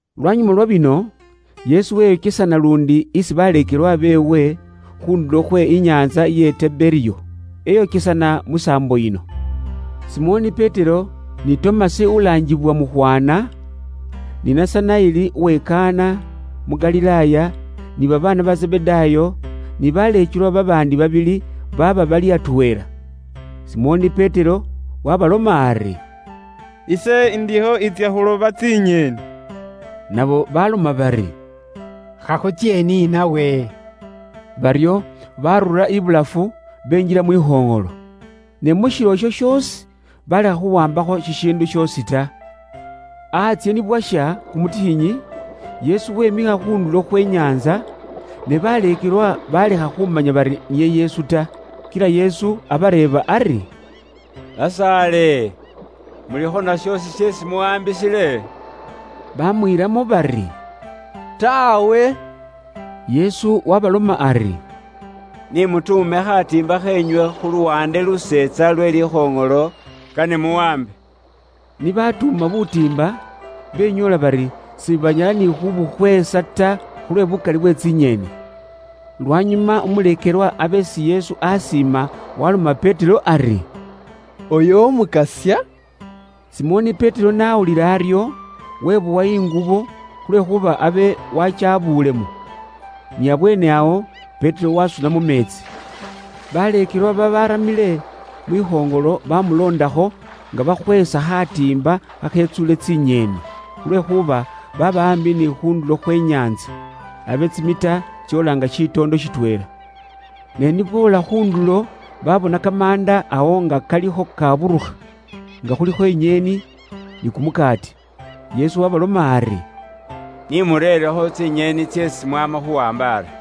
Lwanyuma lwa bino, Yesu weyokesana luundi isi baleekelwa beewe khu ndulo khwe inyaantsa iye Teberiyo. Eyokesana mu saambo yino: Simoni Petero, ni Tomasi ulaangibwa Mukhwana, ni Nasanaeli uwe Kana, mu Galilaaya, ni babaana ba Zebedaayo, ni baleekelwa babaandi babili, baaba bali atweela. Simoni Petero waabaloma ari, “Ise ndikho intsya khuloba tsinyeeni.” Nabo baaloma bari, “Khakhutsye ni nawe.” Baryo baarura ibulafu, benjila mwikhoŋolo. Ne mu shilo isho shoosi baalekha khuwaambakho shishiindu shoosi ta. Antsye ni bwasha kumutikhinyi, Yesu wemikha khu ndulo khwe nyaantsa, ne baleekelwa baalekha khumanya bari niye Yesu ta. Kila Yesu abareeba ari, “Basaale, mulikho na shoosi sheesi muwaambisile?” Baamwiilamo bari, “Taawe.” Yesu waabaloma ari, “Ni mutuume khatiimba kheenywe khu luwaande luulayi lwe likhoŋolo, kane muwaambe.” Ni baatuuma butiimba benyoola bari sibanyala ni khuubukhweesa ta, khulwe buukali bwe tsinyeeni. Lwanyuma umuleekelwa abe isi Yesu akana naabi waaloma Petero ali, “Uyo Umukasya!” Simoni Petero n'awulila aryo, webowa ingubo, khulwekhuuba abe waakyabuulemo. Ni abweene awo Petero waasuna mu meetsi. Baleekelwa babaaramile mwikhoŋolo baamuloondakho, nga bakhweesa khaatimba khakhetsuule tsinyeeni, khulwekhuuba baaba aambi ni khu ndulo khwe nyaantsa. Abe tsimita tsoola nga shitoondo shitweela. Ne ni boola khu ndulo, babona kamaanda awo nga kalikho kaaburukha, nga khulikho inyeeni, ni kumukaati. Yesu waabaloma ari, “Nimureerekho tsinyeeni tseesi mwaama khuwaamba ari.”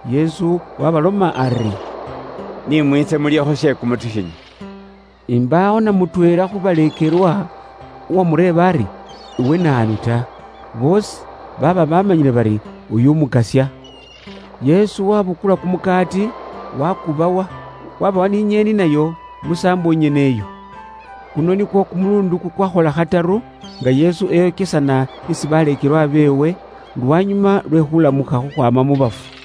Yesu waabaloma ari, “Ni mwiitse mulyekho she kumutikhinyi.” Imbaawo na mutweela khu baleekelwa uwaamureeba ari, “Iwe naanu” ta. Boosi baaba baamanyile bari uyo Umukasya. Yesu waabukula kumukaati, waakubawa; waabawa ni inyeeni nayo musaambo nyene iyo. Kuno nikwo kumuluundi kukwakhola khataru, nga Yesu eyokesana isi baleekelwa beewe, lwanyuma lwe khulamukha khukhwaama mu bafu.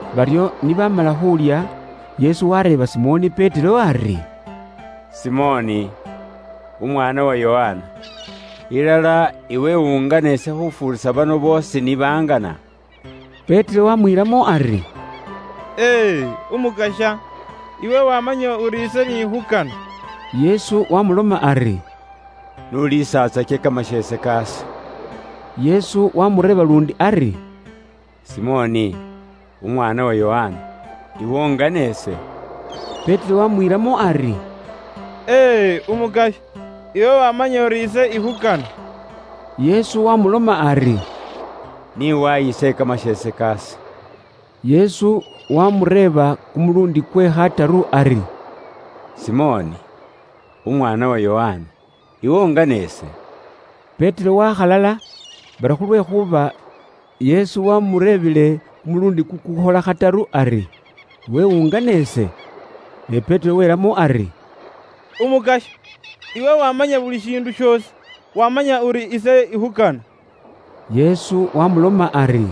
Baryo ni baamala khuulya, Yesu waareeba Simoni Petero ari, “Simoni, umwaana wa Yokana, ilala iwe ungana ise khufuurisa bano boosi?” Petero waamwiilamo ari, “Ee, Umukasya iwe waamanya uri ise n'ikhukana.” Yesu waamuloma ari, “N'uliisatsake kamasheese kaase.” Yesu waamureeba luundi ari, “Simoni, umwaana wa Yokana, iwe ungana ise?” Petero waamwiilamo ari, “E e, Umukasya iwe waamanya uri ise ikhukana.” Yesu waamuloma ari, “Ni wayise kamasheese kaase.” Yesu waamureeba kumuluundi kwe khataru ari, “Simoni, mwaana wa Yokana, iwe ungana ise?” Petero waakhalala, bari khulwekhuuba Yesu waamureebile kumuluundi kukuukhola khataru ari, “Iwe ungana ise?” Ne Petero welamo ari, “Umukasya, iwe waamanya buli shiindu shoosi; waamanya uri ise ikhukana.” Yesu waamuloma ari,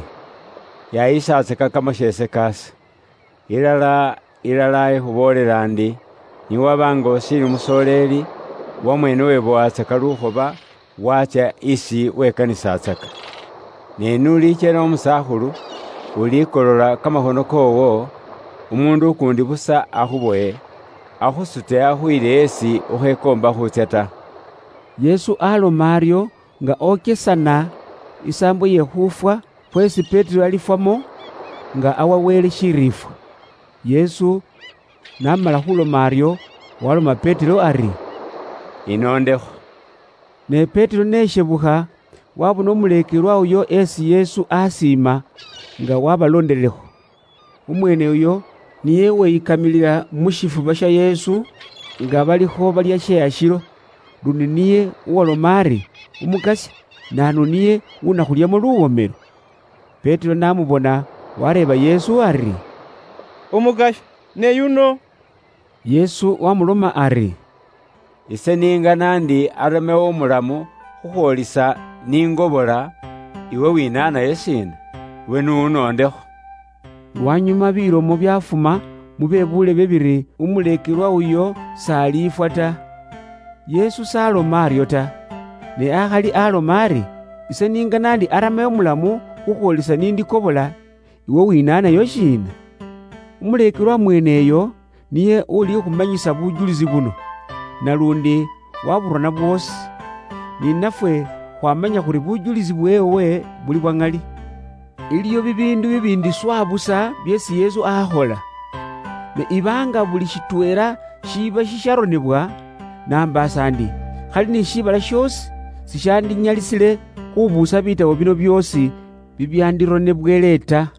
“Yaayisatsaka kamasheese kaase. Ilala, ilala, ikhuboolela indi, ni waba nga ushiili umusoleeli, wamweene webowatsaka lukhoba, waatsya isi wekanisatsaka. Ne n'ulikyela umusaakhulu, ulikolola kamakhono koowo, umuundu ukuundi busa akhubowe, akhusute akhuyile esi ukhekoomba khuutsya ta.” Yesu aaloma aryo nga okesana isaambo iye khuufwa khweesi Petero alifwamo, nga awa Wele shiriifwa. Yesu n'amala khuuloma aryo, waaloma Petero ali, “Inoondekho.” Ne Petero n'eshebukha, waabona umuleekelwa uyo isi Yesu aakana naabi, nga waabaloondelekho. Umweene uyo niye uweyikamilila mu shifuba sha Yesu, nga balikho balya she ashilo. Luundi niye uwaaloma ari, “Umukasya, naanu niye unakhulyamo luwomelo?” Petero n'amubona, waareeba Yesu ari, “Umukasya, ne yuno?” Yesu waamuloma ari, “Ise n'ingana ndi niye aramewo nga umulamu khukhwoolisa ise n'ingobola, iwe winaanayo shiina? Iwe n'unoondekho.” Lwanyuma bilomo byaafuma mu be buulebe biri umuleekelwa uyo s'alifwa ta. Yesu s'aloma aryo ta, ne akhali aloma ari, “Ise n'ingana ndi aramewo mulamu khukhwoolisa nindikobola, iwe winaanayo shiina?” Umuleekelwa mweene uyo niye ulikhumanyisa bujulisi buno, naluundi waaburona bwoosi. Ni nafwe khwaamanya khuri bujulisi bweewe buli bwa ŋali. Iliwo bibiindu bibiindi swa busa byeesi Yesu akhola. Ne iba nga buli shitweela shiba shisharonebwa, nambaasa ndi khali ni shiibala shoosi sishandinyalisile khubuusa buurone bwoosi bubwandironewele ta.